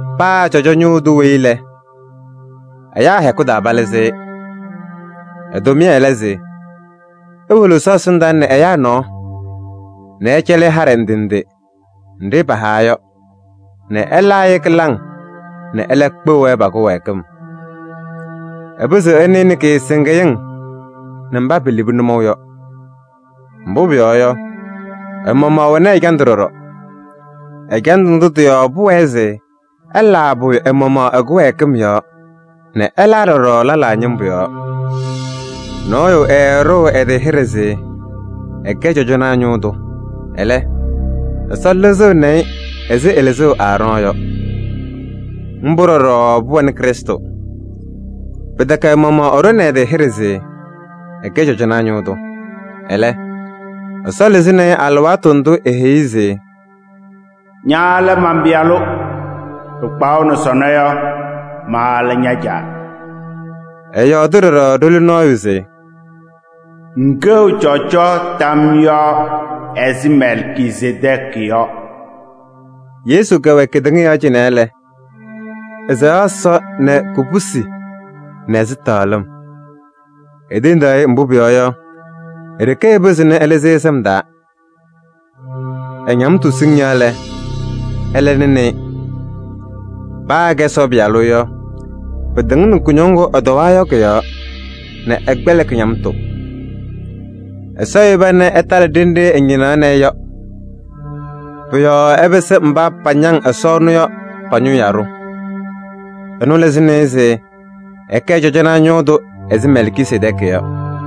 Paa cɔjɔnaa ñʋʋ tʋ weyi lɛ, ɛyaa hɛkʋ taa palɩzɩ-ɩ. Ɛ-tʋmɩyɛ lɛ se ewolo Ɛsɔ ɛsɩndaa nɛ ɛyaa nɔɔ nɛ ɛcɛlɩ-ɩ haɖɛ ndɩ ndɩ nɖɩ pahawa yɔ nɛ ɛlaa-ɩ kɩlaŋ nɛ ɛlɛ kpeɣ-wɛ pa-kɩwɛɛkɩm. Ɛpɩzɩɣ ɛnɩnɩ kɩɩsɩŋɩyɩŋ nɛ mba pelebi nʋmɔʋ yɔ. Mbʋ pʋyɔɔ yɔ, ɛ-maɣmaɣ ɛwɛnɩ ɛjandʋ ɖɔɖɔ. Ɛjandʋ ndʋ tɩ-yɔɔ pʋwɛɛ se ɛlaa pʋyʋ ɛ-maɣmaɣ ɛ-kɩwɛɛkɩm yɔɔ nɛ ɛlaa ɖɔɖɔ lɛlaa ñɩmbʋ yɔɔ. Nɔɔyʋ ɛɛɖʋʋ ɛ-tɩ hɩɖɛ se ɛkɛ cɔjɔnaa ñʋʋ tʋ. Ɛlɛ, Ɛsɔ lɩzɩɣnɩ-ɩ ɛzɩ ɛlɩzʋʋ Aarɔɔnɩ yɔ. Mbʋ ɖɔɖɔ pʋwɛnɩ Krɩstʋ. Pɩtɛkɛ ɛ-maɣmaɣ ɛɖʋnɩ ɛ-tɩ hɩɖɛ se ɛkɛɣ cɔjɔnaa ñʋʋ tʋ. Ɛlɛ, Ɛsɔ lɩzɩnɩ-ɩ alɩwaatʋ ndʋ eheyi-i se: “Ña lɛ man-Pɩyalʋ. Pɩkpaɣʋnɩ sɔnɔ yɔ, ma lɛ ña-Caa.” Ɛyɔɔdɩ ɖɔɖɔ ɖoli nɔɔyʋ se: “Ŋkɛɣ cɔjɔ tam yɔɔ ɛzɩ Mɛlkisedɛɛkɩ yɔ.” Yesu kɛwɛ kedeŋa yɔɔ cɩnɛ lɛ, ɛsɛɣaɣ Ɛsɔ nɛ kubusi nɛ ɛzɩtɛɣlɩm. Etendaɣ-ɩ, mbʋ pʋyɔɔ yɔ, e-ɖeke ɛpɩzɩɣnɩ ɛlɩzɩ-ɩ sɩm taa. Ɛ-ñamtʋ siŋŋ yɔɔ lɛ, ɛlɛ nɩnɩ-ɩ. Paa se ɛkɛ Ɛsɔ Pɩyalʋ yɔ, pɩtɩŋnɩ kʋñɔŋ ŋgʋ ɛtɔwaa yɔ kʋ-yɔɔ nɛ ɛkpɛlɩkɩ ñamtʋ. Ɛsɔ yeba nɛ ɛtalɩ ɖenɖe ɛñɩnaɣnɩ-ɩ yɔ. Pʋ-yɔɔ ɛpɩsɩ mba patɩŋa pañaŋ Ɛsɔ ɛnʋ yɔ pa-ñʋʋ yaɖʋ. Ɛnʋ lɩzɩnɩ-ɩ se ɛkɛ cɔjɔnaa ñʋʋ tʋ ɛzɩ Mɛlkisedɛɛkɩ yɔ.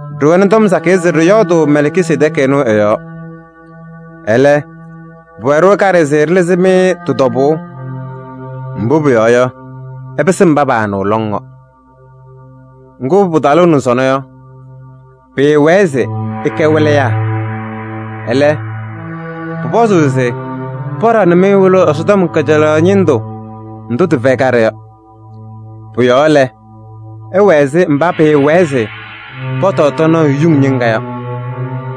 Ɖɩwɛnɩ tɔm sakɩyɛ se ɖɩyɔɔdʋʋ Mɛlkisedɛɛkɩ ɛnʋ ɛ-yɔɔ. Ɛlɛ, pʋwɛ-ɖʋ kaɖɛ se ɖɩlɩzɩ-mɩ tɩ-tɔbʋʋ. Mbʋ pʋyɔɔ yɔ, ɩpɩsɩ mba paanɩɣ lɔŋ yɔ. Ŋgʋ, pɩtalʋʋ nɛ sɔnɔ yɔ, pɩɩwɛɛ se ɩkɛ wɩlɩyaa. Ɛlɛ, pʋpɔzʋʋ se paɖaɣnɩ-mɩ wɩlʋʋ Ɛsɔtɔm kajalaɣ ñɩndʋ ndʋ tɩfɛyɩ kaɖɛ yɔ. Pʋ-yɔɔ lɛ, ɩwɛ ɛzɩ mba pɩɩwɛɛ se pɔtɔɔ tɔɔnaɣ yuŋ ñɩŋga yɔ,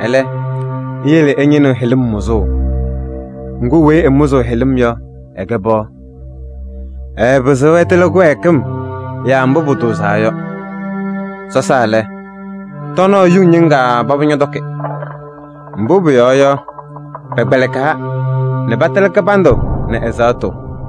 ɛlɛ, iyele ɩnɩɣnɩ hɩlɩm mʋzʋʋ. Ŋgʋ, weyi ɛmʋzʋʋ hɩlɩm yɔ, ɛkɛ pɩɣa. Ɛɛpɩzɩɣ ɛtɩlɩ kɩwɛɛkɩm yaa mbʋ pʋtʋʋzaa yɔ. Sɔsaa lɛ, tɔɔnaɣ yuŋ ñɩŋga paba ñɔtɔkɩ. Mbʋ pʋyɔɔ yɔ, pɛkpɛlɩkaa nɛ patɩlɩ kɩbandʋ nɛ ɛzaɣtʋ.